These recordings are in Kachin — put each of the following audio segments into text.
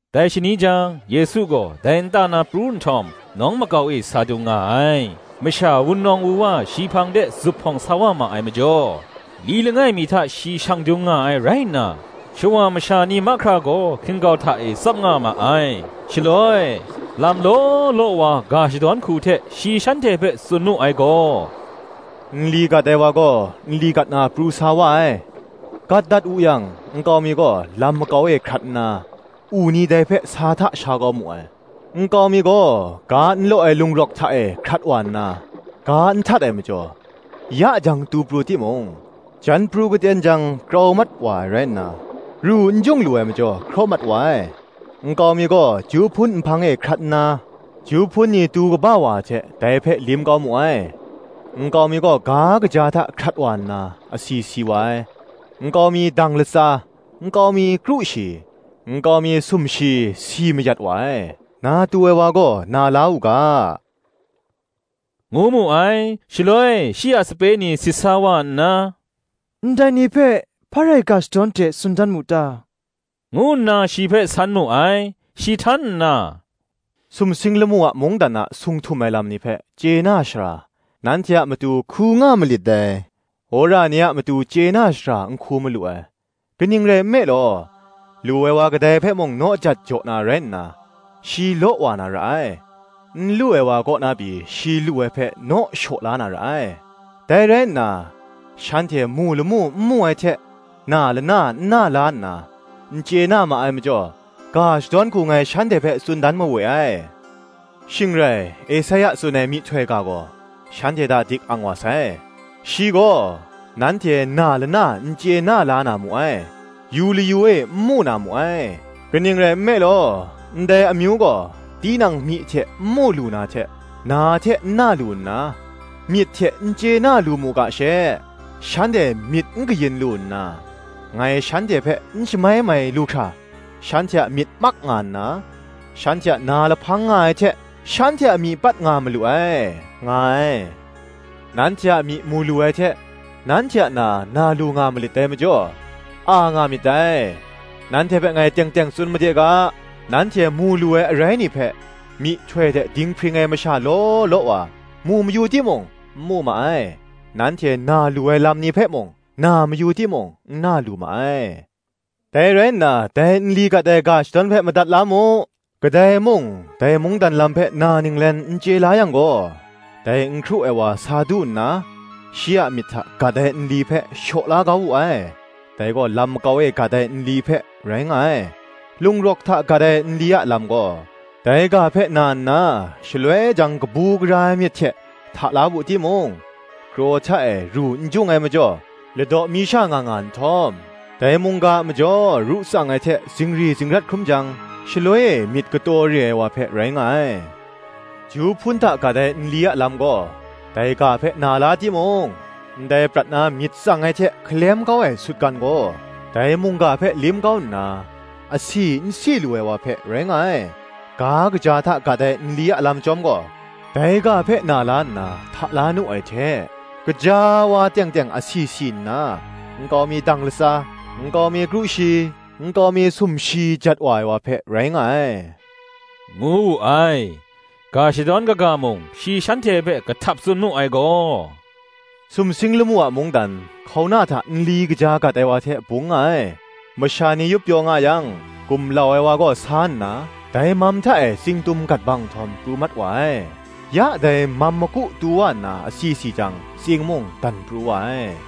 Dai shani jang, Yesu gaw dai nta na pru nhtawm, nawng makau e sa dung nga ai. Masha wunawng wuwa shi hpang de zuphpawng sa wa ma ai majaw, li langai mi hta shi shang dung nga ai rai nna, shawa masha ni mahkra gaw hkin-gau hta e tsap nga ma ai. Shaloi, lam law law wa ga shadawn hku hte shi shanhte hpe tsun mu ai gaw, “Nli gat ai wa gaw nli gat na pru sa wa ai. Gat dat wu yang nkau mi gaw lam makau e hkrat nna, u ni dai hpe sa hta sha kau mu ai. Nkau mi gaw, ga n law ai lung rawk hta e hkrat wa nna, ga n htat ai majaw, ya jang tu pru timung, jan pru katen jang krau mat wa ai rai nna, ru n jung lu ai majaw hkraw mat wa ai. Nkau mi gaw ju hpun nhpang e hkrat nna, ju hpun ni tu kaba wa ai hte, dai hpe lim kau mu ai. Nkau mi gaw ga kaja hta hkrat wa nna, asi si wa ai: nkau mi dang latsa, nkau mi kru shi, nkau mi sumshi si mayat wa ai: na tu ai wa gaw na la u ga,” ngu mu ai. Shaloi shi a sape ni sit wa nna, “Ndai ni hpe hpa rai ga shadawn hte tsun dan mu ta?” ngu nna shi hpe san mu ai. Shi htan nna, “Sumsing lamu a mungdan a sung htum ai lam ni hpe chye na shara, nanhte a matu hku nga malit dai; wora ni a matu chye na shara n hku malu ai. Kaning rai nme law, lu ai wa kadai hpe mung naw jat jaw na rai nna, shi law wa na ra ai; n lu ai wa kaw na pyi shi lu ai hpe naw shaw la na ra ai. Dai rai nna, shanhte mu lamu n mu ai hte, na lana n na la nna, n chye na ma ai majaw, ga shadawn hku ngai shanhte hpe tsun dan mawe ai. Shing rai, Esaia tsun ai myihtoi ga gaw shanhte hta dik ang wa sai. Shi gaw, Nanhte na lana n chye na la na mu ai, Yu layu e n mu na mu ai, Kaning rai nme law, ndai amyu gaw, Tinang myi hte n mu lu na hte Na hte n na lu nna, Myit hte n chye na lu mu ga she, Shanhte myit n kayin lu nna, Ngai shanhte hpe n shamai mai lu hkra Shanhte a myit mak nga nna, Shanhte a na lahpang nga ai hte, Shanhte a myi pat nga malu ai, nga ai. Nanhte a myi mu lu ai hte, nanhte a na, na lu nga malit dai majaw, a nga myit dai. Nanhte hpe ngai teng teng tsun made ga, nanhte mu lu ai arai ni hpe myihtoi hte dinghpring ai masha law law wa, mu mayu timung, n mu ma ai; nanhte na lu ai lam ni hpe mung, na mayu timung, n na lu ma ai. Dai rai nna dai nli gat ai ga shadawn hpe madat la mu. Kadai mung, dai mungdan lam hpe na ninglen n chye la yang gaw, dai n hkru ai wa sa du nna, shi a myit hta gat ai nli hpe shaw la kau wu ai: dai gaw lam makau e gat ai nli hpe rai nga ai. Lung rawk hta gat ai nli a lam gaw, dai ga hpe na nna, shaloi jang kabu gara ai myit hte hta la wu timung, kraw hta e ru n jung ai majaw, ladaw mi sha nga nga nhtawm, dai mungga a majaw ru tsang ai hte zingri zingrat hkrum jang, shaloi e myit kataw re ai wa hpe rai nga ai. Ju hpun hta gat ai nli a lam gaw, dai ga hpe na la timung, ndai prat na myit tsang ai hte hkalem kau ai sutgan gaw, dai mungga hpe lim kau nna, asi n si lu ai wa hpe rai nga ai. Ga kaja hta gat ai nli a lam chyawm gaw, dai ga hpe na la nna hta la nu ai hte, gaja wa teng teng asi si nna, nkau mi dang latsa, nkau mi kru shi, nkau mi sumshi jat wa ai wa hpe, rai nga ai,” ngu wu ai. Ga shadawn kaga mung, shi shanhte hpe kahtap tsun mu ai gaw, “Sumsing lamu a mungdan, hkauna hta nli kaja gat ai wa hte bung nga ai. Masha ni yup pyaw nga yang, gumlau ai wa gaw sa nna, dai mam hta e tsing tum gat bang, nhtawm pru mat wa ai. Ya dai mam maku tu wa nna asi si jang, tsing mung dan pru wa ai.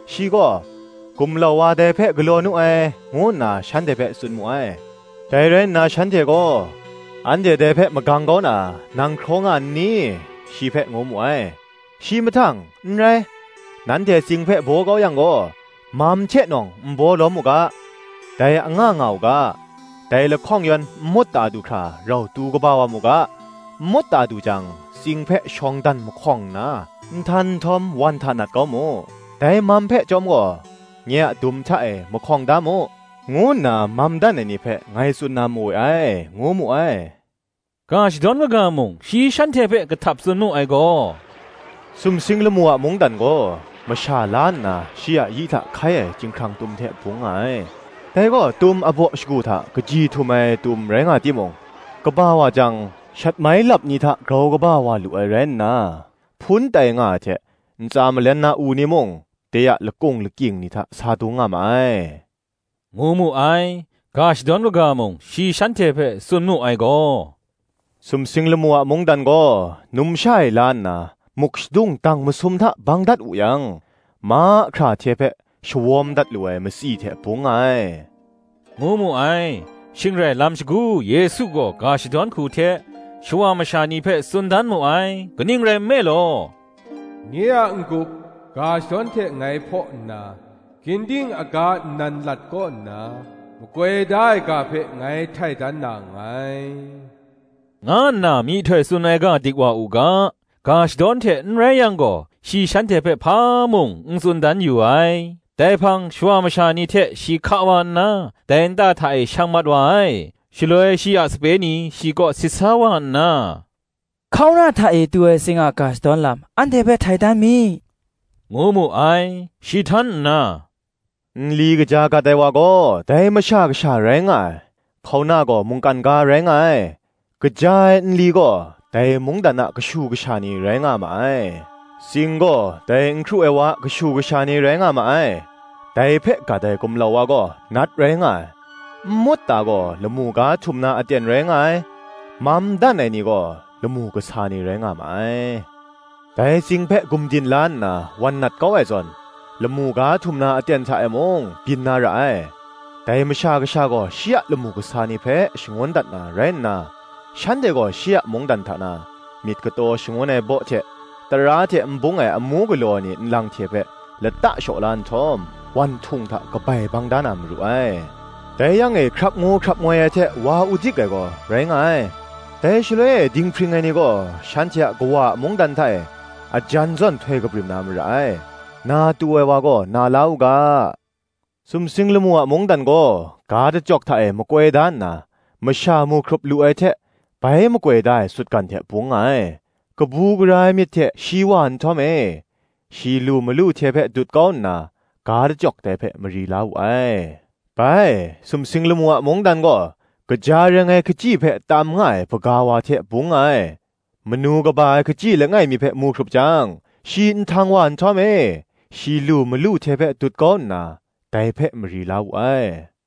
Shi gaw, ‘Gumlau wa dai hpe galaw nu ai,’ ngu nna shanhte hpe tsun mu ai. Dai rai nna shanhte gaw, ‘Anhte dai hpe magang kau na, nang hkraw nga n ni?’ shi hpe ngu mu ai. Shi mahtang, ‘N rai, nanhte tsing hpe baw kau yang gaw, mam hte nawng n baw lawm u ga, dai anga nga u ga. Dai lahkawng yan nmut ta du hkra, rau tu kaba wa mu ga: nmut ta du jang, tsing hpe shawng dan mahkawng nna, nhtan nhtawm wan hta nat kau mu; dai mam hpe chyawm gaw, nye a dum hta e mahkawng da mu, ngu nna mam dan ai ni hpe ngai tsun na mawe ai,” ngu mu ai. Ga shadawn kaga mung, shi shanhte hpe kahtap tsun mu ai gaw, “Sumsing lamu a mungdan gaw, masha la nna shi a yi hta hkai ai chyinghkrang tum hte bung nga ai. Dai gaw tum abaw shagu hta kaji htum ai tum rai nga timung, kaba wa jang, shatmai lap ni hta grau kaba wa lu ai rai nna, hpun tai nga ai hte ntsa malen na u ni mung, de a lakung lakying ni hta sa dung nga ma ai,” ngu mu ai. Ga shadawn kaga mung, shi shanhte hpe tsun mu ai gaw, “Sumsing lamu a mungdan gaw, numsha e la nna, muk shadung dang masum hta bang dat wu yang, mahkra hte hpe shawawm dat lu ai matsi hte bung nga ai,” ngu mu ai. Shing rai lam shagu Yesu gaw ga shadawn hku hte, shawa masha ni hpe tsun dan mu ai: kaning rai nme law, “Nye a n-gup, ga shadawn hte ngai hpaw nna, Ginding aga nnan lat kaw nna, makoi da ai ga hpe ngai htai dan na nngai,” nga nna myihtoi tsun ai ga dik wa u ga, ga shadawn hte n rai yang gaw, shi shanhte hpe hpa mung n tsun dan yu ai. Dai hpang shawa masha ni hte shi hka wa nna, dai nta hta e shang mat wa ai. Shaloi shi a sape ni shi kaw sit sa wa nna, “Hkauna hta e tu ai tsing a ga shadawn lam, anhte hpe htai dan mi,” ngu mu ai. Shi htan nna, “Nli kaja gat ai wa gaw, dai Masha Kasha rai nga ai; hkauna gaw, mungkan ga, rai nga ai; Kaja ai nli gaw, dai mungdan a kashu kasha ni rai nga ma ai; tsing gaw, dai n hkru ai wa a kashu kasha ni rai nga ma ai; dai hpe gat ai gumlau wa gaw, Nat rai nga ai; nmut ta gaw, lamu ga htum na aten rai nga ai; mam dan ai ni gaw, lamu kasa ni rai nga ma ai. Dai tsing hpe gumdin la nna wan nat kau ai zawn, lamu ga htum na aten hta e mung, byin na ra ai. Dai masha kasha gaw shi a lamu kasa ni hpe shangun dat na rai nna, shanhte gaw shi a mungdan hta na, myit kataw shangun ai baw hte tara hte n bung ai amu galaw ai ni nlang hte hpe, lata shaw la nhtawm, wan htung hta kabai bang da na maru ai: dai yang e hkrap ngu hkrap ngoi ai hte wa udik ai gaw, rai nga ai. Dai shaloi e dinghpring ai ni gaw shanhte a Kawa a mungdan hta e, ajan zawn htoi kabrim na mara ai; na tu ai wa gaw na la u ga. Sumsing lamu a mungdan gaw, ga dachyawk hta e makoi da nna, masha mu hkrup lu ai hte, bai makoi da ai sutgan hte bung nga ai: kabu gara ai myit hte shi wa nhtawm e, shi lu malu hte hpe dut kau nna, ga dachyawk dai hpe mari la wu ai. Bai, sumsing lamu a mungdan gaw, kaja reng ai hkachyi hpe tam nga ai hpaga wa hte bung nga ai: manu kaba ai hkachyi langai mi hpe mu hkrup jang, shi nhtang wa nhtawm e, shi lu malu hte hpe dut kau nna, ga dachyawk dai hpe mari la wu ai.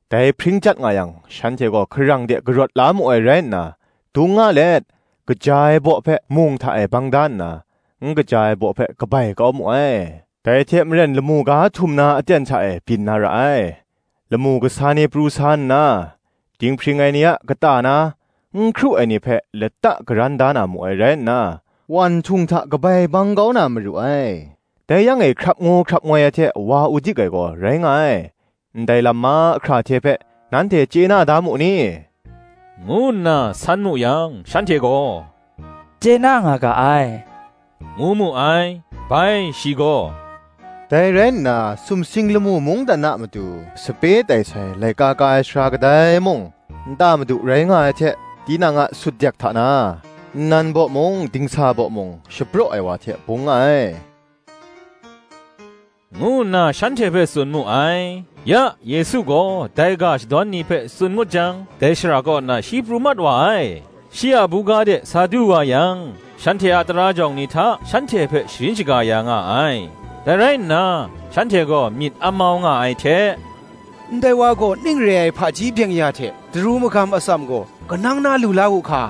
Dai hpring chyat nga yang, shanhte gaw hkarang de karawt la mu ai rai nna, dung nga let, kaja ai baw hpe mung hta e bang da nna, n kaja ai baw hpe, kabai kau mu ai: Dai hte maren lamu ga htum na aten hta e byin na ra ai: Lamu kasa ni pru sa nna, dinghpring ai ni a kata na, n hkru ai ni hpe lata karan da na mu ai rai nna, wan htung hta kabai bang kau na maru ai: dai yang e hkrap ngu hkrap ngoi ai hte wa udik ai gaw rai nga ai. “Ndai lam mahkra hte hpe, nanhte chye na da mu ni?” ngu nna san mu yang, shanhte gaw, “Chye na nga ga ai,” ngu mu ai. Bai shi gaw, Dai rai nna sumsing lamu mungdan a matu sape tai sai laika ka ai sara kadai mung, nta madu rai nga ai hte, tinang a sutdek hta na, nnan baw mung dingsa baw mung shapraw ai wa hte bung nga ai,” ngu nna shanhte hpe tsun mu ai. Ya, Yesu gaw dai ga shadawn ni hpe tsun ngut jang, dai shara kaw na shi pru mat wa ai. Shi a buga de sa du wa yang shanhte a tara jawng ni hta shanhte hpe sharin shaga ya nga ai; dai rai nna, shanhte gaw myit amau nga ai hte, “Ndai wa gaw, ning re ai hpaji byeng-ya hte daru magam atsam gaw, kanang na lu la wu hka?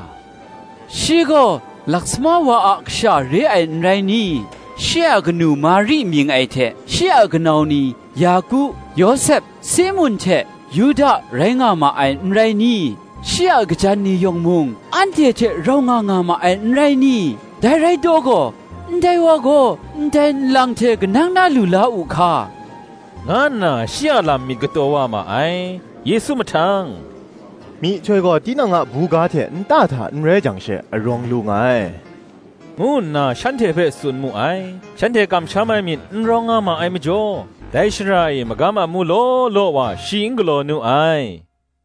shi gaw lasama wa a kasha re ai, n rai ni? shi a kanu Mari mying ai hte, shi a kanau ni Yaku, Yawsep, Simun hte Yuda rai nga ma ai, n rai ni? shi a kajan ni yawng mung, anhte hte rau nga nga ma ai, n rai ni? dai rai taw gaw, ndai wa gaw, ndai nlang hte kanang na lu la wu hka?” nga nna shi a lam myit kataw wa ma ai. Yesu mahtang “Myihtoi gaw tinang a buga hte nta hta n rai jang she, arawng lu nga ai,” ngu nna shanhte hpe tsun mu ai. Shanhte kamsham ai myit n rawng nga ma ai majaw, dai shara e magam amu law law wa shi n galaw nu ai.